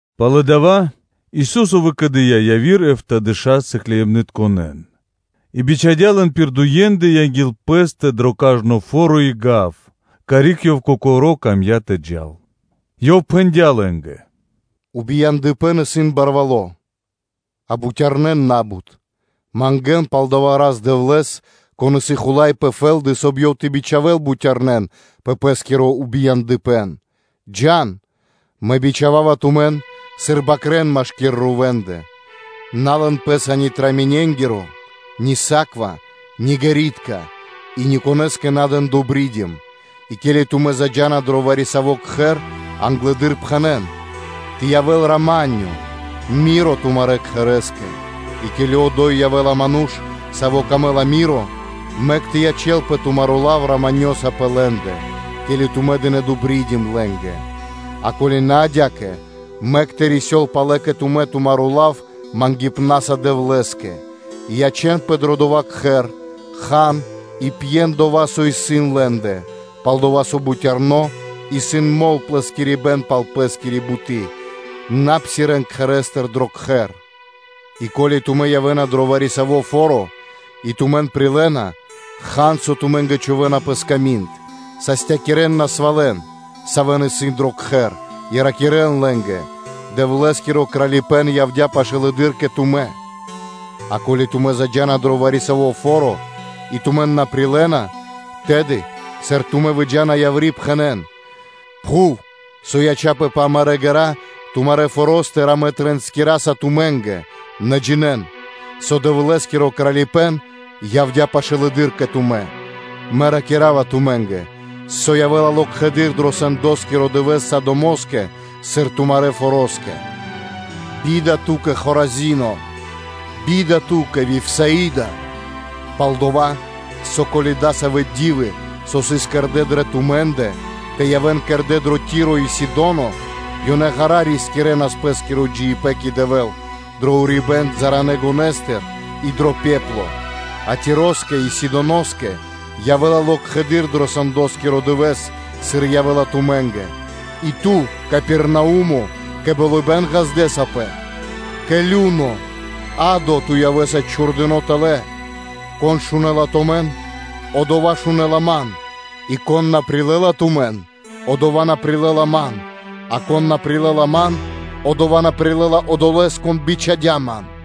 Пало́ дава́ Рай Дэвэл выкэдыя́ яви́р эфтадэша́ сыкляибнытконэ́н и бичхадя́ лэн пир дуендэ анги́л Пэ́стэ дро кажно фо́ро и гав, карик Ёв Кокоро́ камдя́ тэ джал. Ёв пхэндя́ лэ́нгэ: “Убияндыпэн исын барвало́, а бутярнэ́ исын на́бут; мангэ́н пал дава́ Рас-Дэвлэ́с, Кон исын Хула́й пэ фэ́лды, соб (кай) Ёв тэ бичхавэл бутярнэн пэ Пэ́скиро убияндыпэн. Джа́н! Мэ бичхава́ва тумэн, сыр бакрэ́н машки́р рувэндэ. На лэн пэ́са ни муенгиро (кошэлько), ни саква, ни ґэритка, и никонэ́скэ на дэн ‘добридим’. И ке́ли тумэ́ заджа́на дро вари-саво́ кхэр, англэды́р пхэнэ́н: “Тэ явэ́л рама́нё (миро) тумарэ́ кхэрэ́скэ.” И ко́ли одо́й явэ́ла ману́ш, саво́ камэ́ла рама́нё (миро), мэк тэ ячэ́лпэ тумаро́ лав “раманёса” пэ лэ́ндэ, ке́ли тумэ́ дынэ́ ‘добридим’ лэ́нгэ; а ко́ли на адя́кэ, мэк тэ рисёл палэ кэ тумэ́ тумаро́ лав мангипнаса Дэвлэ́скэ; и ячэ́нпэ дро дова́ кхэр, хан и пьен дова́, со исын лэ́ндэ: пал-дова́ со бутярно исын мол плэскирибнаскэ пал пэ́скири буты́. На псирэ́н кхэрэ́стыр дро кхэр. И ко́ли тумэ́ явэ́на дро вари-саво́ фо́ро и тумэн прилэ́на, хан, со тумэ́нгэ чхувэ́на пэ сками́нд; састякирэн насвалэн, савэ́ исын дро кхэр, и ракирэ́н лэ́нгэ: ‘Дэвлэ́скиро Кралипэ́н явдя́ пашылэды́р кэ тумэ́’. А ко́ли тумэ́ заджа́на дро вари-саво́ фо́ро, и тумэн на прилэ́на, тэды, сыр тумэ́ выджа́на яври́, пхэнэ́н: ‘Пхув, со ячяпэ пэ амарэ́ ґэра́, тумарэ́ форо́стыр амэ тринскираса тумэ́нгэ; нэ джинэ́н, со Дэвлэ́скиро Кралипэ́н явдя́ пашылэды́р кэ тумэ́.’” Мэ ракира́ва тумэ́нгэ, со явэ́ла локхэды́р дро сэндоскиро дывэ́с Содомоскэ, сыр тумарэ́ фороскэ. Бида ту́кэ, Хоразино! Бида ту́кэ, Вифсаида! Пал-дова́ со, ко́ли дасавэ́ ди́вы, со сыс кэрдэ́ дрэ тумэ́ндэ, тэ явэ́н кэрдэ́ дро Ти́ро и Сидоно, ёнэ ґара́ рискирэнас пэ́скиро джиибэ́н кэ Дэвэ́л дро урибэ́н балытконэ гонэстыр и дро пепло; а Тироскэ и Сидоноскэ явэ́ла локхэды́р дро сэндоскиро дывэ́с, сыр явэ́ла тумэ́нгэ; и ту, Капернау́ме, кэ болыбэ́н ґаздэсапэ! Кэ лю́но (адо) ту явэ́са чхурдыно́ тэлэ́. Кон шунэ́ла тумэн, одова́ шунэ́ла Ман, и кон на прилэ́ла тумэн, одова́ на прилэ́ла Ман; а кон на прилэ́ла Ман, одова́ на прилэ́ла Одолэ́с, Кон бичхадя́ Ман.”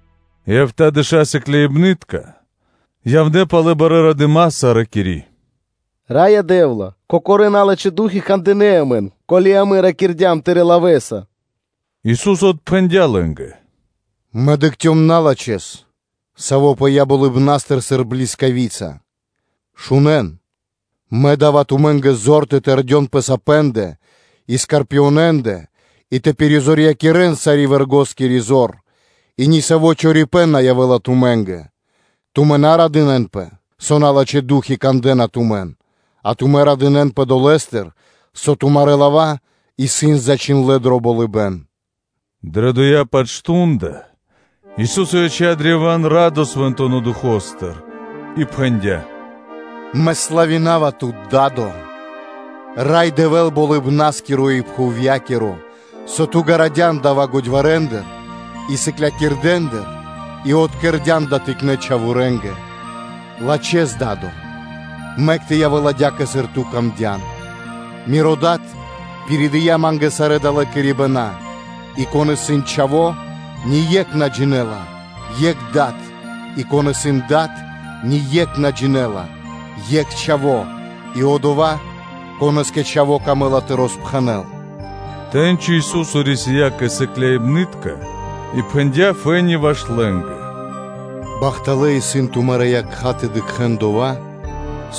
И эфтадэша́ сыкляибны́тка явнэ́ палэ барэ́ радыма́са, ракири́: “Раё Дэ́вла! Кокорэ́ налачхэ́ ду́хи (фаны) кандынэ́ амэн, ке́ли амэ ракирдям Тырэ́ лавэ́са.” Ису́со отпхэндя́ лэ́нгэ: “Мэ дыкхцём налачхэ́с, саво́ пыя́ болыбна́стыр сыр блискавица; акэ, шунэ́н: Мэ да́ва тумэ́нгэ зор тэ тэрдён пэ сапэндэ и скорпионэндэ и тэ пиризорьякирэн сари́ вэргоскири зор и нисаво́ чорипэ́н на явэ́ла тумэ́нгэ; и тумэ́ на радынэ́нпэ, со налачхэ́ ду́хи (фаны) кандэ́на тумэн, а тумэ́ радынэ́нпэ долэ́стыр, со тумарэ́ лава́ исын зачхиндлэ́ дро болыбэ́н.” Дрэ дова́-паць мардо́ (шту́нда) Ису́со яця́ древа́н радо Свэнтонэ́ Духо́стыр и пхэндя́: “Мэ барьякирава Тут, Да́до, Рай Дэвэ́л Болыбна́скиро и пхувья́киро, со Ту ґарадян дава́ годьварэндыр и сыклякирдэндыр и откэрдян дава́ тыкнэ́ чхаворэнгэ. Лачхэ́с, Да́до, мэк тэ явэ́л адя́кэ, сыр Ту камдян. Миро Дад пиридыя Ма́нгэ сарэ́ далэ́ кэрибэна; и кон исын Чхаво́, ние́кх на джинэ́ла, екх Дад, и кон исын Дад, ние́кх на джинэ́ла, екх Чхаво́, и одолэ́, конэ́скэ Чхаво́ камэ́ла тэ роспхэнэл.” Тэ́ньци Ису́со рисия́ кэ сыкляибны́тка и пхэндя́ фэ́ни ваш лэ́нгэ: “Бахталэ́ исын тумарэ́ якха́ тэ дыкхэ́н дова́,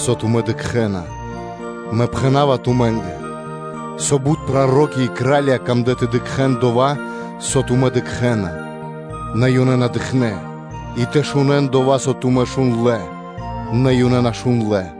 со тумэ́ дыкхэ́на! Мэ пхэна́ва тумэ́нгэ, со бут проро́ки и кра́лья камлэ́ тэ дыкхэ́н дова́, со тумэ́ дыкхэ́на, нэ ёнэ на дыкхнэ́; и тэ шунэ́н дова́, со тумэ́ шундлэ́, нэ ёнэ на шундлэ́.”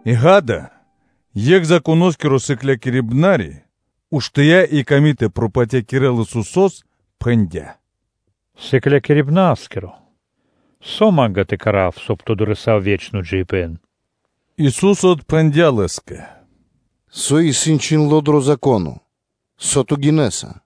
И, ґа́да, екх Законоскиро сыклякирибнари, уштыя́ и ками тэ пропатякирэл Исусо́с, пхэндя́: “Сыклякирибнарискиро! Со ма́нгэ тэ кэра́в, соб (кай) тэ дорэсав ве́чно джиибэ́н?” Ису́со отпхэндя́ Лэ́скэ: “Со исын чхиндло́ дро Зако́но? Со ту гинэса?”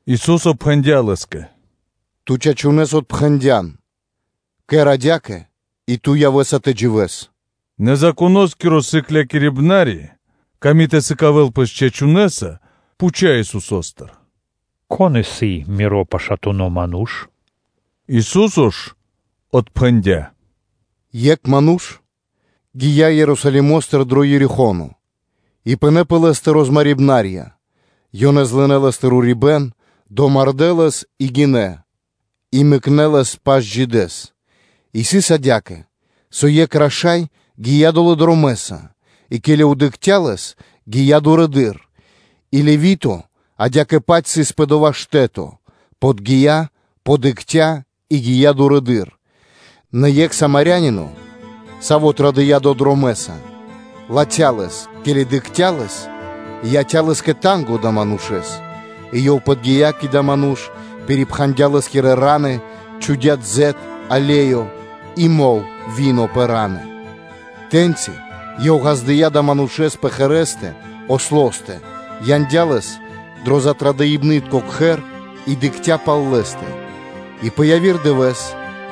Ису́со пхэндя́ Лэ́скэ: “Ту чачунэ́с отпхэндян, кэр адя́кэ, и ту явэ́са тэ дживэ́с.” Нэ Законоскиро сыклякирибнари, ками тэ сыкавэ́л пэс чачунэса, пхуця́ Исусо́стыр: “Кон исын миро пашатуно ману́ш?” Ису́со ж отпхэндя́: “Екх ману́ш гия́ Ерусалимо́стыр дро Ерихо́но и пынэ́ пэ лэ́стэ розмарибнарья; ёнэ злынэ лэ́стыр урибэ́н, домардэ́ лэс и гинэ́; и мэкнэ́ лэс пашджидэс. И сыс адя́кэ, со екх раша́й гия́ долэ́ дромэ́са и, ке́ли дыкхця́ лэс, гия́ дурэды́р. И Левито адя́кэ-паць сыс пэ дова́ штэ́то, подги́я, подыкхця́ и гия́ дурыдыр. Нэ екх самарянино, саво́ традыя́ долэ́ дромэ́са, латхя́ лэс, ке́ли дыкхця́ лэс, яця́ лэ́скэ танго (жалко) далэ́ манушэ́с; и ёв подги́я кэ дава́ ману́ш, пирипхандя лэ́скирэ фра́нсы (раны), чхудя́ дзэт (олеё) и мол (вино) пэ раны; тэ́ньчи ёв ґаздыя́ далэ́ манушэ́с пэ ослостэ, яндя́ лэс дро затрадыпнытко кхэр (гостиница) и дыкхця́ пал лэ́стэ. И пэ яви́р дывэ́с,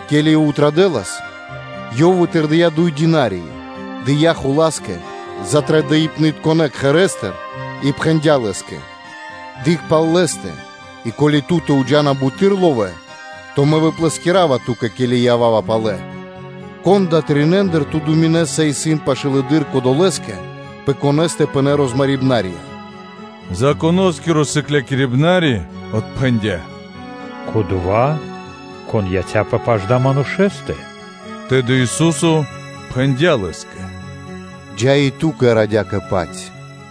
ке́ли ёв традэлас пэ́скэ, ёв вытырдыя дуй динарии, дыя́ хула́скэ затрадыпнытконэ кхэрэ́стыр и пхэндя́ лэ́скэ: ‘Дыкх пал лэ́стэ; и, ко́ли ту́тэ уджана буты́р ловэ́, то мэ выплэскирава ту́кэ, ке́ли ява́ва палэ.’ Кон далэ́ тринэндыр, ту думинэса, исын пашылэды́р кодолэ́скэ, пэ конэ́стэ пынэ́ розмарибнарья?” Законоскиро сыклякирибнари отпхэндя́: “Кодова́, кон яця́пэ пашы́л адалэ́ манушэ́стэ.” Тэды Ису́со пхэндя́ Лэ́скэ: “Джа́ и ту кэр адя́кэ-паць.”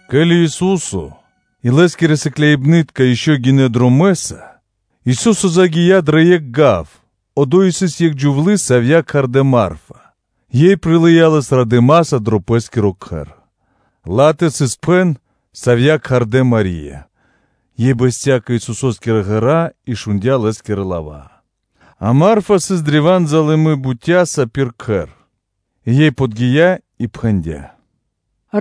Ке́ли Ису́со и Лэ́скирэ сыкляибны́тка ишчо (инкэ́) гинэ́ дромэ́са, Ису́со загия́ дро екх гав; одо́й сыс екх джувлы́, савья́ кхардэ́ Марфа, ёй прилыя́ Лэс радыма́са дро пэ́скиро кхэр. Ла́тэ сыс пхэн, савья́ кхардэ́ Мари́я, ёй бэсця́ кэ Исусо́скирэ ґэра́ и шундя́ Лэ́скирэ лава́. А Марфа сыс древа́н залыны (залыми) бутяса пир кхэр, и ёй подги́я и пхэндя́: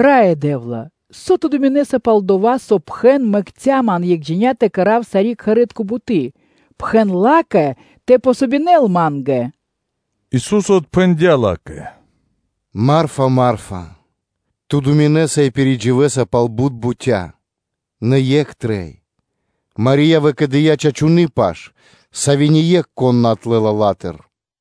“Раё Дэ́вла! Со Ту думинэса пал дова́, со пхэн мэкця́ ман екхджиня тэ кэра́в сари́ кхэри́тко буты́? Пхэн ла́кэ тэ дзн васт ма́нгэ!” Ису́со отпхэндя́ ла́кэ: “Марфе! Марфе! Ту думинэса и кэрэ́са пхаро́ пэ ило́ пэ́скэ пал бут бутя́, нэ екх трэй. Мари́я выкэдыя́ чачуны́ паш, сави́ нико́н на отлэла ла́тыр.”